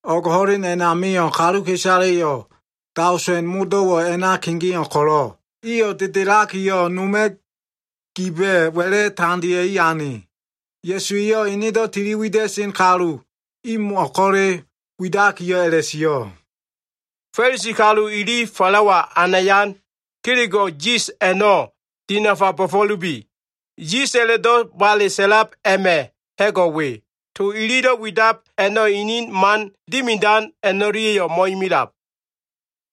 O꞉g ho꞉len a꞉namio꞉ kaluka꞉isaleyo꞉ daosen modo꞉wo꞉ a꞉na kegeo꞉ ko꞉lo꞉, iyo꞉ dedelakiyo꞉, noma꞉ giba꞉ wa꞉la꞉ tandea꞉i ane. Ya꞉su eyo꞉ enedo꞉ tili wida꞉sen kalu imo꞉ ko꞉le widakiyo꞉ a꞉la꞉sio꞉, “Fa꞉lisi kalu ili falawalo꞉ anayan kelego꞉ yis a꞉no꞉ dinafa bo꞉fo꞉lubi. Yis a꞉la꞉do꞉ bale sa꞉lab a꞉ma꞉ ha꞉go꞉ we, to ililo꞉ widab a꞉no꞉ inin man dimidan a꞉no꞉lia꞉yo꞉ mo꞉imilab.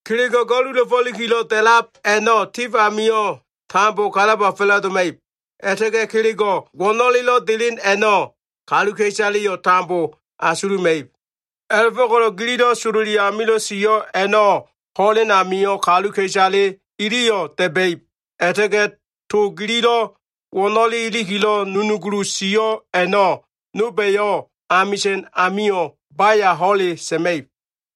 Kelego꞉ ga꞉lula꞉folikilo꞉ da꞉lab a꞉no꞉, tif amio꞉ tambo kalaba fa꞉la꞉doma꞉ib. A꞉la꞉ta꞉ga꞉ kelego꞉ wo꞉no꞉lelo꞉ delen a꞉no꞉ kaluka꞉isaleyo꞉ tambo asuluma꞉ib. A꞉la꞉fo꞉ko꞉lo꞉ gililo꞉ sololi amilo꞉ sio꞉ a꞉no꞉, ho꞉len amio꞉ kaluka꞉isale iliyo꞉ da꞉ba꞉ib. A꞉la꞉ta꞉ga꞉ to gililo꞉ wo꞉no꞉le ilikilo꞉ nunugulu sio꞉ a꞉no꞉, nolba꞉yo꞉ amisa꞉n amio꞉ baya ho꞉le sa꞉ma꞉ib.”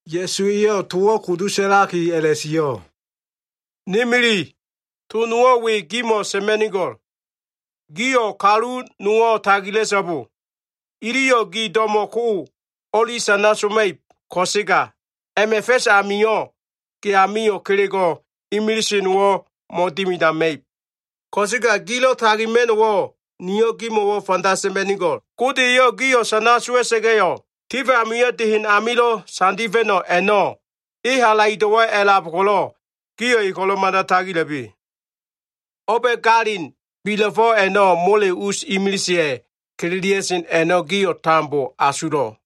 Ya꞉su eyo꞉ towo꞉ kudu sa꞉laki a꞉la꞉sio꞉, “Ni mili, to nowo꞉ we gimo꞉ sa꞉ma꞉nigo꞉l. Gio꞉ kalu nowo꞉ tagila꞉so꞉bo! Iliyo꞉ gi do꞉mo꞉ ko o꞉li sana soma꞉ib ko꞉sega, a꞉ma꞉ fa꞉s amio꞉ ge amio꞉ kelego꞉ imilise nowo꞉ mo꞉dimidama꞉ib. Ko꞉sega gilo꞉ tagima꞉no꞉wo꞉, niyo꞉ gimo꞉wo꞉ fanda sa꞉ma꞉nigo꞉l. Gode eyo꞉ gio꞉ sana sowa꞉sa꞉ga꞉yo꞉, tif amio꞉ de hen amilo꞉ sandifa꞉no꞉ a꞉no꞉ e halaido꞉wo꞉ a꞉lab ko꞉lo꞉, gio꞉ e ko꞉lo꞉ mada tagila꞉bi. O꞉ba꞉ galin bila꞉fo꞉ a꞉no꞉ mole us imiliseya꞉ kililia꞉sen a꞉no꞉ gio꞉ tambo asulo꞉.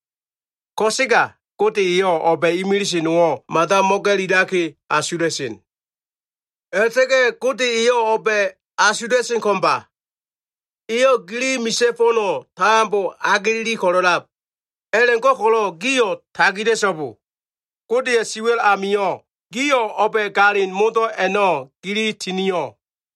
Ko꞉sega Gode eyo꞉ o꞉ba꞉ imilise nowo꞉ mada mo꞉ga꞉lilaki asula꞉sen. A꞉la꞉ta꞉ga꞉ Gode eyo꞉ o꞉ba꞉ asula꞉sen ko꞉mba! Eyo꞉ gili misa꞉ fo꞉no꞉ tambo ageleli ko꞉lo꞉lab. A꞉la꞉go꞉ko꞉lo꞉ gio꞉ tagila꞉so꞉bo! Godeya꞉ siwa꞉l amio꞉ gio꞉ o꞉ba꞉ galin modo꞉ a꞉no꞉ gili tinio꞉.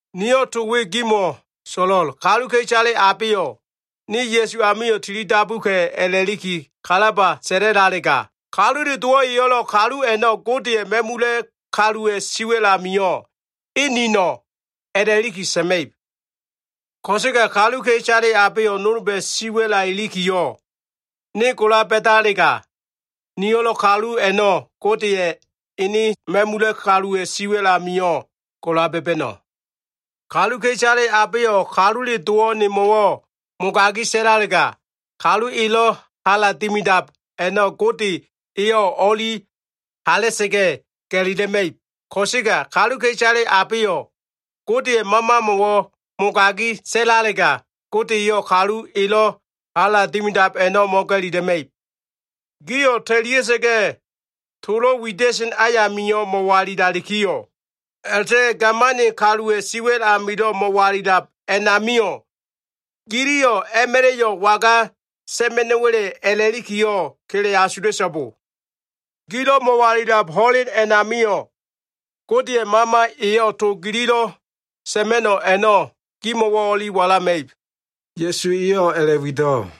“Niyo꞉ to we gimo꞉ so꞉lo꞉l. Kaluka꞉isale abeyo꞉ ‘Ne Ya꞉su amio꞉ tilidabuka꞉’ a꞉la꞉liki kalaba sa꞉lalega, Kalule Dowo꞉ eyo꞉lo꞉ kalu a꞉no꞉ Godeya꞉ ma꞉mula꞉ kaluwa꞉ si wa꞉l amio꞉ ‘E nino꞉’ a꞉la꞉liki sa꞉ma꞉ib. Ko꞉sega kaluka꞉isale abeyo꞉ nolba꞉ siwa꞉la ilikiyo꞉, ne gola ba꞉dalega, niyo꞉lo꞉ kalu a꞉no꞉ Godeya꞉ ene ma꞉mula꞉ kaluwa꞉ si wa꞉l amio꞉ gola ba꞉ba꞉no꞉. Kaluka꞉isale abeyo꞉ Kalule Dowo꞉ nemo꞉wo꞉ mogagi sa꞉lalega, kalu elo꞉ hala dimidab a꞉no꞉ Gode eyo꞉ o꞉li hala꞉sa꞉ga꞉ ga꞉lila꞉ma꞉ib. Ko꞉sega kaluka꞉isale abeyo꞉ Godeya꞉ Mamamo꞉wo꞉ mogagi sa꞉lalega, Gode eyo꞉ kalu elo꞉ hala dimidab a꞉no꞉ mo꞉ga꞉lila꞉ma꞉ib. “Gio꞉ ta꞉lia꞉sa꞉ga꞉ tolo꞉ wida꞉sen ayami mo꞉walilalikiyo꞉ a꞉la꞉ta꞉ga꞉ gamani kaluwa꞉ siwa꞉l amilo꞉ mo꞉walilab a꞉namio꞉, giliyo꞉ a꞉ma꞉la꞉yo꞉ waga sa꞉ma꞉no꞉wa꞉le a꞉la꞉likiyo꞉ kele asula꞉so꞉bo! Gilo꞉ mo꞉walilab ho꞉len a꞉namio꞉ Godeya꞉ Mama eyo꞉ to gililo꞉ sa꞉ma꞉no꞉ a꞉no꞉ gimo꞉wo꞉ walama꞉ib.” Ya꞉su eyo꞉ a꞉la꞉wido꞉.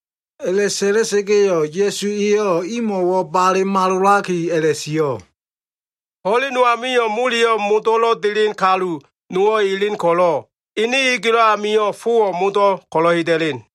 A꞉la꞉sa꞉la꞉sa꞉ga꞉yo꞉ Ya꞉su eyo꞉ imo꞉wo꞉ bale malolaki a꞉la꞉sio꞉, “Ho꞉len no amio꞉, moleyo꞉ modo꞉lo꞉ delen kalu nowo꞉ elen ko꞉lo꞉, ene egelo꞉ amio꞉ fowo꞉ modo꞉ ko꞉lo꞉ heda꞉len.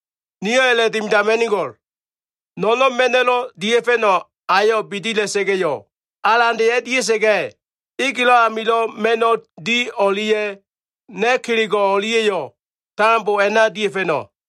Niyo꞉ a꞉la꞉dimidama꞉nigo꞉l. No꞉no꞉n ma꞉no꞉lo꞉ dia꞉fa꞉no꞉ ayo꞉ bidila꞉sa꞉ga꞉yo꞉, alande a꞉dia꞉sa꞉ga꞉, egelo꞉ amilo꞉ ma꞉no꞉ di o꞉lia꞉ na꞉ kelego꞉ o꞉lia꞉yo꞉ tambo a꞉na dia꞉fa꞉no꞉.’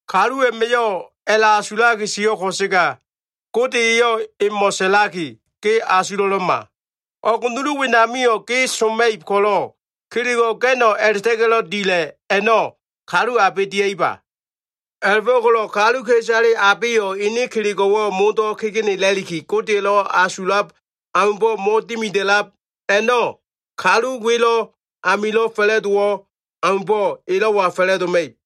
Kalu a꞉ma꞉yo꞉ a꞉la꞉asulaki sio꞉ ko꞉sega Gode eyo꞉ emo꞉ sa꞉laki ‘Ge asulo꞉lo꞉ma! O꞉g nulu wenamio꞉ ge soma꞉ib ko꞉lo꞉ kelego꞉ ga꞉no꞉ a꞉la꞉ta꞉ga꞉lo꞉ dila꞉ a꞉no꞉ kalu abe dia꞉iba?’ A꞉la꞉fo꞉ko꞉lo꞉ kaluka꞉isale abeyo꞉ ene kelego꞉wo꞉ modo꞉ kegenela꞉liki Godeya꞉lo꞉ asulab aumbo꞉ mo꞉dimida꞉lab a꞉no꞉, kalu welo꞉ amilo꞉ fa꞉la꞉dowo꞉ aumbo꞉ elo꞉wa fa꞉la꞉doma꞉ib.”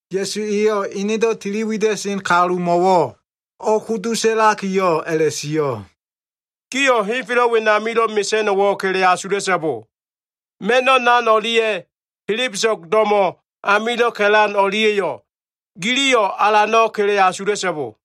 Ya꞉su eyo꞉ enedo꞉ tiliwida꞉sen kalumo꞉wo꞉ o꞉kudu sa꞉lakiyo꞉ a꞉la꞉sio꞉, “Gio꞉ henfelo꞉ wenamilo꞉ mesa꞉no꞉wo꞉ kele asula꞉so꞉bo. Ma꞉no꞉ nan o꞉lia꞉ helebeso꞉g do꞉mo꞉ amilo꞉ ka꞉lan o꞉lia꞉yo꞉ giliyo꞉ alano꞉ kele asula꞉so꞉bo.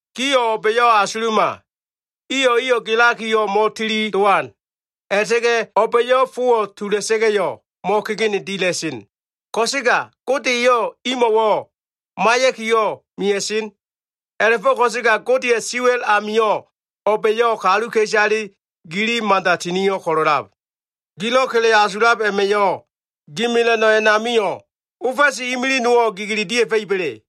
Gio꞉ o꞉ba꞉yo꞉ asuluma! Iyo꞉ eyo꞉ gelakiyo꞉ mo꞉tili dowan. A꞉la꞉ta꞉ga꞉ o꞉ba꞉yo꞉ fowo꞉ tula꞉sa꞉ga꞉yo꞉ mo꞉kegene dila꞉sen. Ko꞉sega Gode eyo꞉ imo꞉wo꞉ maiya꞉kiyo꞉ mea꞉sen. A꞉la꞉fo꞉ ko꞉sega Godeya꞉ siwa꞉l amio꞉ o꞉ba꞉yo꞉ kaluka꞉isale gili mada tinio꞉ ko꞉lo꞉lab. Gilo꞉ kele asulab a꞉ma꞉yo꞉, gi mela꞉no꞉ a꞉namio꞉ ofa꞉si imili nowo꞉ gigili dia꞉fa꞉iba꞉le?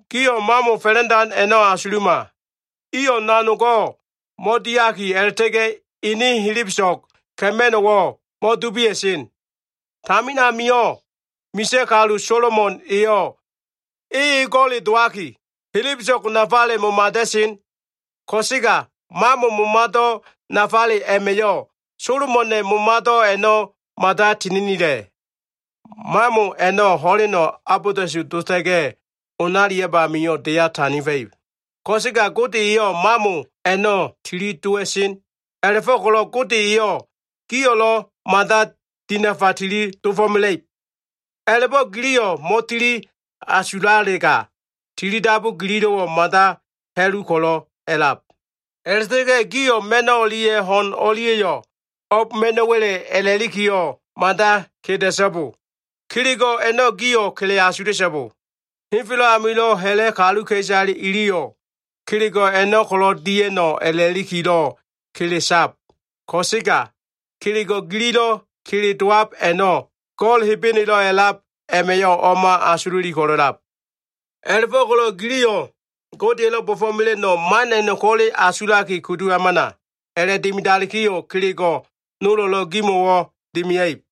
Gio꞉ mamo fa꞉la꞉ndan a꞉no꞉ asuluma! Iyo꞉ nanogo꞉ mo꞉diaki, a꞉la꞉ta꞉ga꞉ ene helebeso꞉g ka꞉ma꞉no꞉wo꞉ mo꞉dubia꞉sen. Tamin amio꞉ misa꞉ kalu Solomon eyo꞉ e ego꞉le dowaki, helebeso꞉go꞉ nafale momada꞉sen. Ko꞉sega mamo momado꞉ nafale a꞉ma꞉yo꞉, Solomona꞉ momado꞉ a꞉no꞉ mada tininila꞉. Mamo a꞉no꞉ ho꞉leno꞉ abolda꞉su dota꞉ga꞉ onaliab amio꞉, deya sandifa꞉ib. Ko꞉sega Gode eyo꞉ mamo a꞉no꞉ tili dowa꞉sen. A꞉la꞉fo꞉ko꞉lo꞉ Gode eyo꞉ gio꞉lo꞉ mada dinafa tili dofo꞉mela꞉ib. A꞉la꞉bo꞉ giliyo꞉ mo꞉tili asulalega, tilidabu gililo꞉wo꞉ mada ha꞉lu ko꞉lo꞉ a꞉lab. A꞉la꞉ta꞉ga꞉ gio꞉ ma꞉n o꞉lia꞉ ho꞉n o꞉lia꞉yo꞉ o꞉b ma꞉no꞉wa꞉le a꞉la꞉likiyo꞉, mada keda꞉so꞉bo. Kelego꞉ a꞉no꞉ gio꞉ kele asula꞉so꞉bo. Henfelo꞉ amilo꞉ ha꞉la꞉ kaluka꞉isale iliyo꞉ kelego꞉ a꞉no꞉ ko꞉lo꞉ dia꞉no꞉ a꞉la꞉likilo꞉ kele sab. Ko꞉sega kelego꞉ gililo꞉ kele dowab a꞉no꞉ Go꞉l Hebenelo꞉ a꞉lab a꞉ma꞉yo꞉ o꞉ma asululi ko꞉lo꞉lab. A꞉la꞉fo꞉ko꞉lo꞉ giliyo꞉ Godeya꞉lo꞉ bo꞉fo꞉mela꞉no꞉ man a꞉no꞉ ko꞉le asulaki kudu hamana. A꞉la꞉dimidalikiyo꞉ kelego꞉ nolo꞉lo꞉ gimo꞉wo꞉ dimia꞉ib.”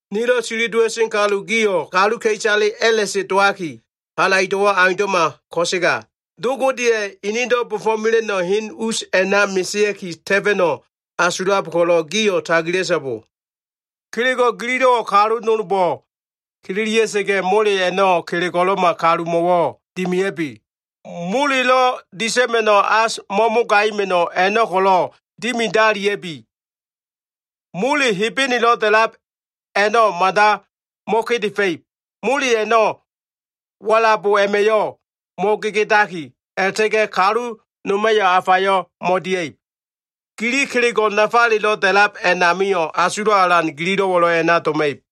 “Nilo꞉ tiliwida꞉sen kalu gio꞉ kaluka꞉isale a꞉la꞉se dowaki, halaido꞉wo꞉ aundo꞉ma ko꞉sega, Do Godeya꞉ enedo꞉ bo꞉fo꞉mela꞉no꞉ hen us a꞉na mesea꞉ki ta꞉fa꞉no꞉ asulab ko꞉lo꞉ gio꞉ tagila꞉so꞉bo. Kelego꞉ gililo꞉wo꞉ kalu nolbo꞉ kililia꞉sa꞉ga꞉, mole a꞉no꞉ kelego꞉lo꞉ma kalumo꞉wo꞉ dimia꞉bi. Molelo꞉ disa꞉ma꞉no꞉ as, mo꞉mogaima꞉no꞉ a꞉no꞉ ko꞉lo꞉ dimidalia꞉bi. Mole Hebenelo꞉ da꞉lab a꞉no꞉ mada mo꞉kedefa꞉ib. Mole a꞉no꞉ walabo a꞉ma꞉yo꞉ mo꞉gegedaki, a꞉la꞉ta꞉ga꞉ kalu noma꞉yo꞉ afayo꞉ mo꞉dia꞉ib. Gili kelego꞉ nafalelo꞉ da꞉lab a꞉namio꞉, asulo꞉ alan gililo꞉wo꞉lo꞉ a꞉na doma꞉ib.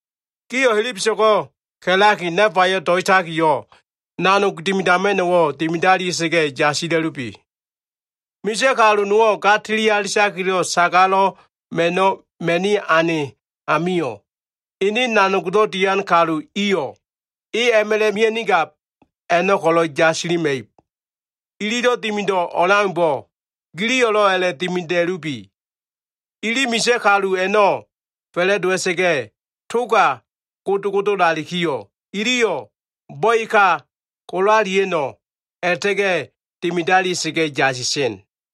“Gio꞉ helebeso꞉go꞉ ka꞉laki, nafayo꞉ do꞉itakiyo꞉, nanog dimidama꞉no꞉wo꞉ dimidalia꞉sa꞉ga꞉ yasila꞉lubi. Misa꞉ kalu nowo꞉ ga tililiakilo꞉ sagalo꞉ ma꞉no꞉ ma꞉ni ane amio꞉, ene nanogdo꞉ dian kalu iyo꞉ e a꞉ma꞉la꞉ mia꞉nigab a꞉no꞉ ko꞉lo꞉ yasilima꞉ib. Ililo꞉ dimido꞉ o꞉leaumbo꞉, giliyo꞉lo꞉ a꞉la꞉dimida꞉lubi. Ili misa꞉ kalu a꞉no꞉ fa꞉la꞉dowa꞉sa꞉ga꞉ toga godogodolalikiyo꞉, iliyo꞉ bo꞉eka ko꞉lalia꞉no꞉ a꞉la꞉ta꞉ga꞉ dimidalia꞉sa꞉ga꞉ yasisen.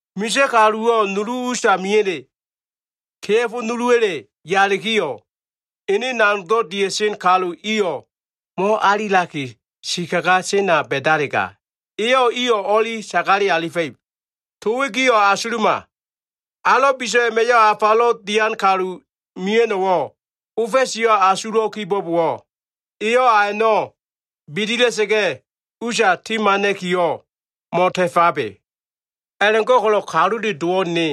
Misa꞉ kaluwo꞉ nulu usamiya꞉le, kea꞉fo nuluwa꞉le yalikiyo꞉, ene nanogdo꞉ dia꞉sen kalu iyo꞉ mo꞉alilaki sikaga sena ba꞉dalega, eyo꞉ iyo꞉ o꞉li sagale alifa꞉ib. “To we gio꞉ asuluma. Alo꞉ biso꞉ a꞉ma꞉yo꞉ afalo꞉ dian kalu mia꞉no꞉wo꞉ ofa꞉siyo꞉ asulo꞉ kibo꞉bowo꞉, eyo꞉ a a꞉no꞉ bidila꞉sa꞉ga꞉ usa timana꞉kiyo꞉ mo꞉ta꞉fabe. A꞉la꞉go꞉ko꞉lo꞉ Kalule Dowo꞉ ne,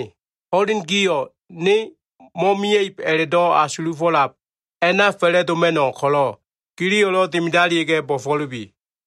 ho꞉len gio꞉ ne mo꞉mia꞉ib a꞉la꞉do꞉ asulufo꞉lab a꞉na fa꞉la꞉doma꞉no꞉ ko꞉lo꞉, giliyo꞉lo꞉ dimidalia꞉ga꞉ bo꞉fo꞉lubi.”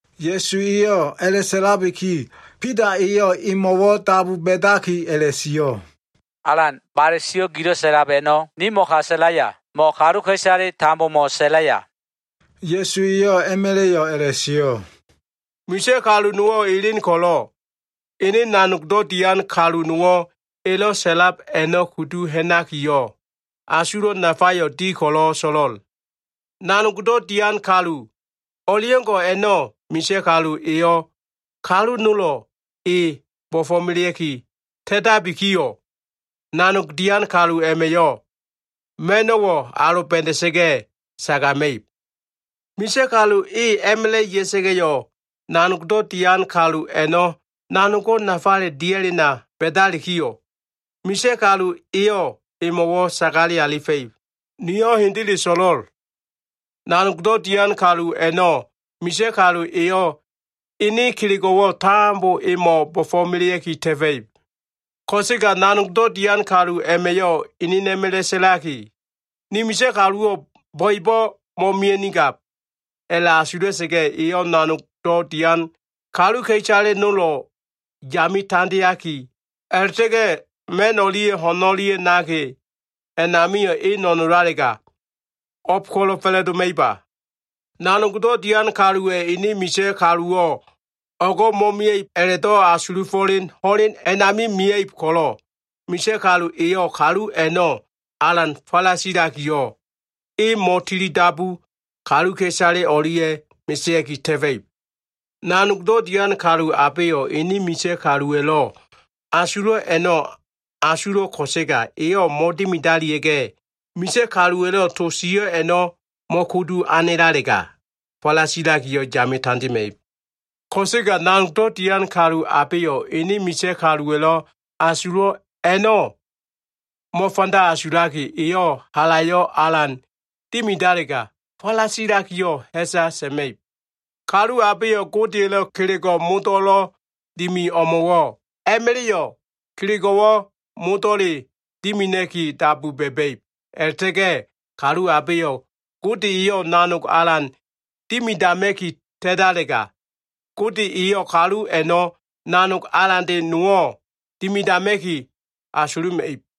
Ya꞉su eyo꞉ a꞉la꞉sa꞉labiki, Bida eyo꞉ emo꞉wo꞉ dabu ba꞉daki a꞉la꞉sio꞉, “Alan, bale sio꞉ gilo꞉ sa꞉lab a꞉no꞉, nimo꞉ ka sa꞉laya, mo꞉ kaluka꞉isale tambomo꞉ sa꞉laya?” Ya꞉su eyo꞉ a꞉ma꞉la꞉yo꞉ a꞉la꞉sio꞉, “Misa꞉ kalu nowo꞉ elen ko꞉lo꞉, ene nanogdo꞉ dian kalu nowo꞉ elo꞉ sa꞉lab a꞉no꞉ kudu ha꞉nakiyo꞉, asulo꞉ nafayo꞉ di ko꞉lo꞉ so꞉lo꞉l. Nanogdo꞉ dian kalu o꞉leo꞉ngo꞉ a꞉no꞉ misa꞉ kalu eyo꞉ kalu nolo꞉ e bo꞉fo꞉melea꞉ki ta꞉tabikiyo꞉, nanog dian kalu a꞉ma꞉yo꞉ ma꞉no꞉wo꞉ aloba꞉da꞉sa꞉ga꞉ sagama꞉ib. Misa꞉ kalu e a꞉ma꞉la꞉ ya꞉sa꞉ga꞉yo꞉, nanogdo꞉ dian kalu a꞉no꞉ nanogo꞉ nafale dia꞉lena ba꞉dalikiyo꞉, misa꞉ kalu eyo꞉ emo꞉wo꞉ sagale alifa꞉ib. Niyo꞉ hendele so꞉lo꞉l. Nanogdo꞉ dian kalu a꞉no꞉ misa꞉ kalu eyo꞉ enen kelego꞉wo꞉ tambo emo꞉ bo꞉fo꞉melea꞉ki ta꞉fa꞉ib. Ko꞉sega nanogdo꞉ dian kalu a꞉ma꞉yo꞉ enena꞉ma꞉la꞉ sa꞉laki, ‘Ni misa꞉ kaluwo꞉ bo꞉ebo꞉ mo꞉mia꞉nigab’ a꞉la꞉asula꞉sa꞉ga꞉, eyo꞉ nanogdo꞉ dian kaluka꞉isale nolo꞉ yame tandeaki, a꞉la꞉ta꞉ga꞉ ma꞉n o꞉lia꞉ ho꞉n o꞉lia꞉yo꞉ naki a꞉namio꞉ e no꞉nolalega, o꞉b ko꞉lo꞉ fa꞉la꞉doma꞉iba? Nanogdo꞉ dian kaluwa꞉ ene misa꞉ kaluwo꞉ o꞉go꞉ mo꞉mia꞉ib a꞉la꞉do꞉ asulufo꞉len ho꞉len a꞉nami mia꞉ib ko꞉lo꞉, misa꞉ kalu eyo꞉ kalu a꞉no꞉ alan falasilakiyo꞉, e mo꞉tilidabu kaluka꞉isale o꞉lia꞉ mesea꞉ki ta꞉fa꞉ib. Nanogdo꞉ dian kalu abeyo꞉ ene misa꞉ kaluwa꞉lo꞉ asulo꞉ a꞉no꞉ asulo꞉ ko꞉sega eyo꞉ mo꞉dimidalia꞉ga꞉, misa꞉ kaluwa꞉lo꞉ to sio꞉ a꞉no꞉ mo꞉kudu ha꞉nalega, falasilakiyo꞉ yame tandema꞉ib. Ko꞉sega nanogdo꞉ dian kalu abeyo꞉ ene misa꞉ kaluwa꞉lo꞉ asulo꞉ a꞉no꞉ mo꞉fanda asulaki, eyo꞉ halayo꞉ alan dimidalega, falasilakiyo꞉ ha꞉sa sa꞉ma꞉ib. Kalu abeyo꞉ Godeya꞉lo꞉ kelego꞉ modo꞉lo꞉ dimi o꞉mo꞉wo꞉ a꞉ma꞉la꞉yo꞉ kelego꞉wo꞉ modo꞉le dimina꞉ki dabu ba꞉ba꞉ib. A꞉la꞉ta꞉ga꞉ kalu abeyo꞉ Gode eyo꞉ nanog alan dimidama꞉ki ta꞉talega, Gode eyo꞉ kalu a꞉no꞉ nanog alande nowo꞉ dimidama꞉ki asuluma꞉ib.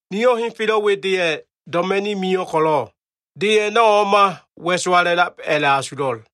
“Niyo꞉ henfelo꞉ we deya꞉ doma꞉ni mio꞉ ko꞉lo꞉, de a꞉no꞉ o꞉ma wa꞉sowala꞉lab a꞉la꞉asulo꞉l.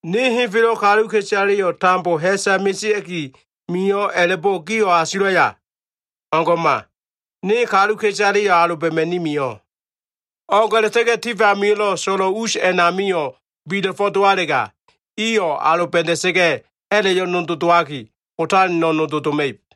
Ne henfelo꞉ kaluka꞉isaleyo꞉ tambo ha꞉sa mesea꞉ki mio꞉ a꞉la꞉bo꞉ gio꞉ asulaya? O꞉ngo꞉ma! Ne kaluka꞉isaleyo꞉ aloba꞉ma꞉ni mio꞉. O꞉g a꞉la꞉ta꞉ga꞉ tif amio꞉, so꞉lo꞉wo꞉ us a꞉namio꞉ bila꞉fo꞉ dowalega, iyo꞉ aloba꞉da꞉sa꞉ga꞉, a꞉la꞉yo꞉ nodo dowaki, otaleno꞉ nodo doma꞉ib.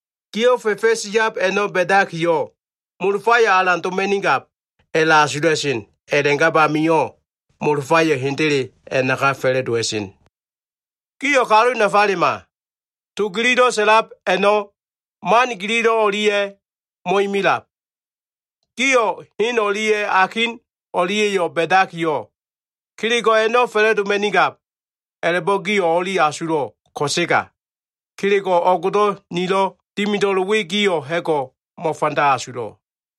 Gio꞉ fa꞉fa꞉s yab a꞉no꞉ ba꞉dakiyo꞉, ‘molofayo꞉ alan doma꞉nigab’ a꞉la꞉asula꞉sen. A꞉la꞉gab amio꞉, molofayo꞉ hendele a꞉naka fa꞉la꞉dowa꞉sen. Gio꞉ kalu nafalema! To gililo꞉ sa꞉lab a꞉no꞉, man gililo꞉ o꞉lia꞉yo꞉ mo꞉imilab. Gio꞉ hen o꞉lia꞉ akin o꞉lia꞉yo꞉ ba꞉dakiyo꞉, kelego꞉ a꞉no꞉ fa꞉la꞉doma꞉nigab a꞉la꞉bo꞉ gio꞉ o꞉li asulo꞉ ko꞉sega, kelego꞉ o꞉gdo꞉ nilo꞉ dimida꞉lo꞉l we gio꞉ ha꞉go꞉ mo꞉fanda asulo꞉.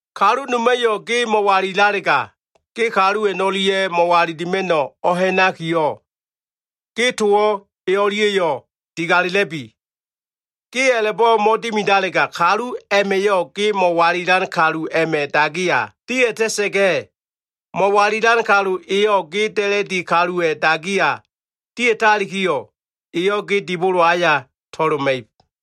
Kalu noma꞉yo꞉ ge mo꞉walilalega, ge kalu a꞉no꞉lia꞉ mo꞉walilima꞉no꞉ o꞉ha꞉nakiyo꞉, ge towo꞉ e o꞉lia꞉yo꞉ digala꞉la꞉bi. Ge a꞉la꞉bo꞉ mo꞉dimidalega, kalu a꞉ma꞉yo꞉ ge mo꞉walilan kalu a꞉ma꞉ dagiya dia꞉ta꞉sa꞉ga꞉, mo꞉walilan kalu eyo꞉ ge da꞉la꞉di kaluwa꞉ dagiya dia꞉talikiyo꞉, eyo꞉ ge dibolo aya to꞉loma꞉ib.